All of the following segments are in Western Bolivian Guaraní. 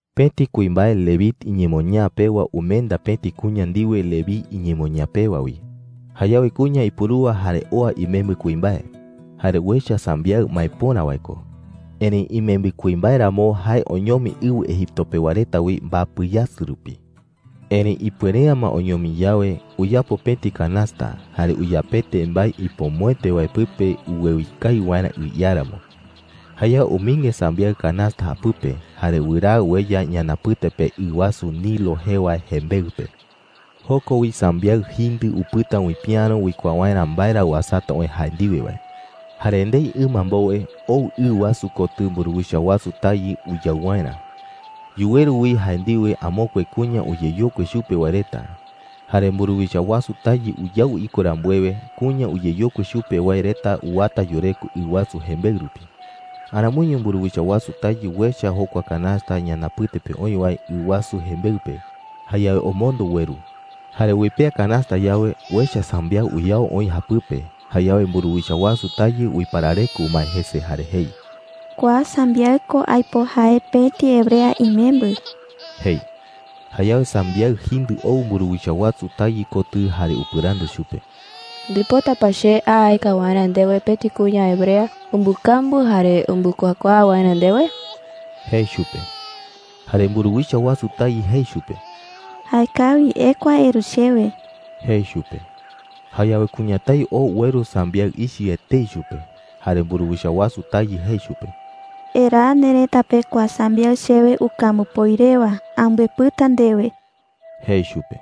Pëti kuimbae Leví iñemoñaa pewa umenda pëti kuña ndiwe Leví iñemoñaa pewa wi. Jayawe kuña ipurúa jare oa imembɨ kuimbae. Jare uecha sambiaɨ maepöra wae ko. Erëi imembɨ kuimbae ramo, jae oñomi ɨwɨ Egipto pewa reta wi mbapɨ yasɨ rupi. Erëi ipuere’ä ma oñomi yawe, uyapo pëti canasta, jare uyapete mbae ipomoete wae pɨpe uwewi kawi waerä ɨ iáramo. Jayawe umɨinge sambiaɨ canasta japɨpe, jare wɨraa ueya ñanapɨte pe ɨ wasu Nilo jee wae jembeɨ pe. Joko wi sambiaɨ jindɨ upɨta uipiäro uikuaa waerä mbae ra uasata oï jae ndiwe wae. Jare ndei ɨma mbowe, ou ɨ wasu kotɨ mburuwicha wasu tayɨ uyau waerä. Yuweru wi jae ndiwe amokue kuña uyeyokui chupe wae reta. Jare mburuwicha wasu tayɨ uyau iko rambuewe, kuña uyeyokui chupe wae reta uwata yureko ɨ wasu jembeɨ rupi. Aramoiño mburuwicha wasu tayɨ uecha jokua canasta ñanapɨte pe oï wae ɨ wasu jembeɨ pe. Jayawe omondo ueru. Jare uipea canasta yawe, uecha sambiaɨ uyao oï japɨpe. Jayawe mburuwicha wasu tayɨ uiparareko umae jese jare jei: “Kua sambiaɨ ko aipo jae pëti hebrea imembɨ,” jei. Jayawe sambiaɨ jindɨ ou mburuwicha wasu tayɨ kotɨ jare upɨrandu chupe: “¿Ndipota pa che a aeka waerä ndewe pëti kuña hebrea umbɨkambu jare umbɨkuakuaa waerä ndewe?” jei chupe. Jare mburuwicha wasu tayɨ jei chupe: “Jaekawi, ekua eru chewe,” jei chupe. Jayawe kuñatái oo ueru sambiaɨ ichɨ etei chupe. Jare mburuwicha wasu tayɨ jei chupe: “Eraa nerëta pe kua sambiaɨ chewe ukambupoi rewa. Ambɨepɨta ndewe,” jei chupe.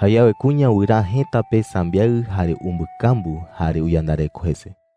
Jayawe kuña wɨraa jëta pe sambiaɨ, jare umbɨkambu, jare uyandareko jese.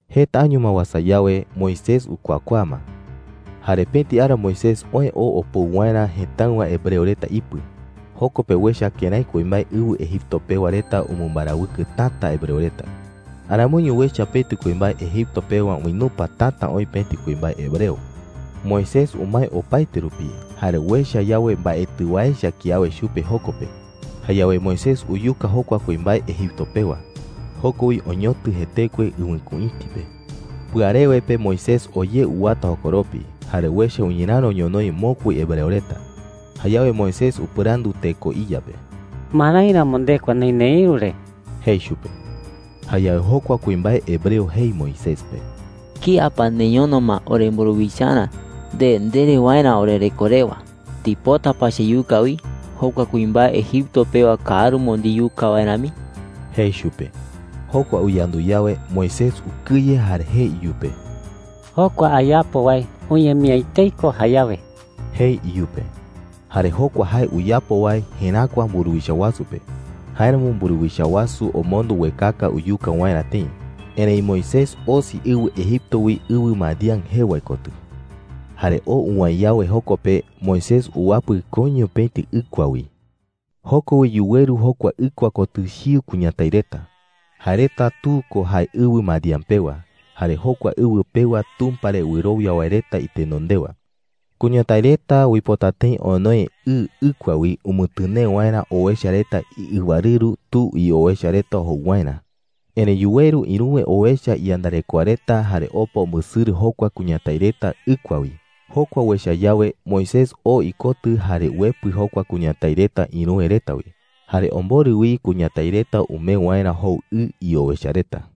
Jeta año ma uasa yawe, Moisés ukuakuaa ma. Jare pëti ara Moisés oë oo opou waerä jëtáɨwa hebreo reta ipɨ. Joko pe uecha kërái kuimbae ɨwɨ Egipto pewa reta umɨmbarawɨkɨ täta hebreo reta. Aramoiño uecha pëti kuimbae Egipto pewa uinupa täta oï pëti kuimbae hebreo. Moisés umae opaete rupi, jare uecha yawe mbaetɨ wae echa kiawe chupe joko pe, jayawe Moisés uyuka jokua kuimbae Egipto pewa. Joko wi oñotɨ jetekue ɨwɨkuïti pe. Pɨarewe pe Moisés oo ye uwata jokoropi, jare uecha uñeräro ñonoï mokui hebreo reta. Jayawe Moisés upɨrandu teko iya pe: “¿Marái ramo ndekua neï neïru re?” jei chupe. Jayawe jokua kuimbae hebreo jei Moisés pe: “¿Kía pa neñono ma oremburuwicharä nde ndere waerä orereko rewa?” jei. “¿Ndipota pa cheyuka wi, jokua kuimbae Egipto pewa káarumo ndiyuka wae rami?” jei chupe. Jokua uyandu yawe, Moisés ukɨye jare jei iyupe: “Jokua ayapo wae uñemi’ä etei ko jayawe,” jei iyupe. Jare jokua jae uyapo wae jeräkua mburuwicha wasu pe. Jáeramo mburuwicha wasu omondo uekaka uyuka waerä tëi. Erëi Moisés osi ɨwɨ Egipto wi ɨwɨ Madián jee wae kotɨ. Jare oo uwäe yawe joko pe, Moisés uwapɨ koiño pëti ɨkua wi. Joko wi yuweru jokua ɨkua kotɨ chiu kuñatái reta. Jae reta tu ko jae ɨwɨ Madián pewa, jare jokua ɨwɨ pewa Tumpa re wɨrowia wae reta itenondewa. Kuñatái reta uipota tëi onoe ɨ ɨkua wi umɨtɨnee waerä owecha reta iɨwarɨru tu iowecha reta jou waerä. Erëi yuweru ïruwe owecha iyandarekoa reta jare opa umbɨsɨrɨ jokua kuñatái reta ɨkua wi. Jokua uecha yawe, Moisés oo ikotɨ jare uepɨ jokua kuñatái reta ïruwe reta wi. Jare omborɨ wi kuñatái reta umee waerä jou ɨ iowecha reta.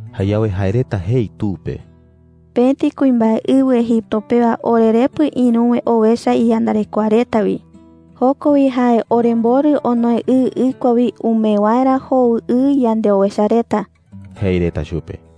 Jayawe jae reta jei tu pe: “Pëti kuimbae ɨwɨ Egipto pewa orerepɨ ïruwe owecha iyandarekoa reta wi. Joko wi jae oremborɨ onoe ɨ ɨkua wi umee waerä jou ɨ yandeowecha reta,” jei reta chupe.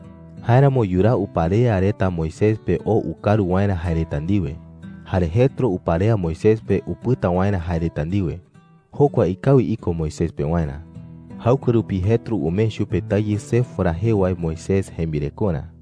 Jáeramo yuraa uparea reta Moisés pe oo ukaru waerä jae reta ndiwe. Jare Jetro uparea Moisés pe upɨta waerä jae reta ndiwe. Jokua ikawi iko Moisés pewarä. Jaɨkue rupi Jetro umee chupe tayɨ Séfora jee wae Moisés jembirekorä.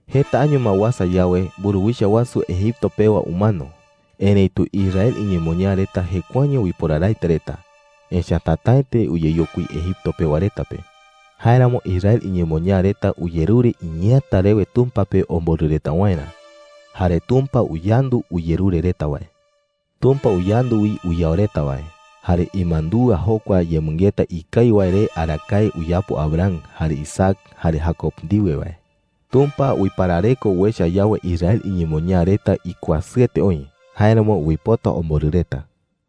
Jeta año ma uasa yawe, mburuwicha wasu Egipto pewa umano. Erëitu Israel iñemoñaa reta jekuaeño uiporaraete reta, echa’ä tätaete uyeyokui Egipto pewa reta pe. Jáeramo Israel iñemoñaa reta uyerure iñeeäta rewe Tumpa pe omborɨ reta waerä. Jare Tumpa uyandu uyerure reta wae. Tumpa uyandu wi uyao reta wae, jare imandúa jokua yemɨngeta ikawi wae re arakae uyapo Abraham, jare Isaac, jare Jacob ndiwe wae. Tumpa uiparareko uecha yawe Israel iñemoñaa reta ikuasɨete oï; jáeramo uipota omborɨ reta.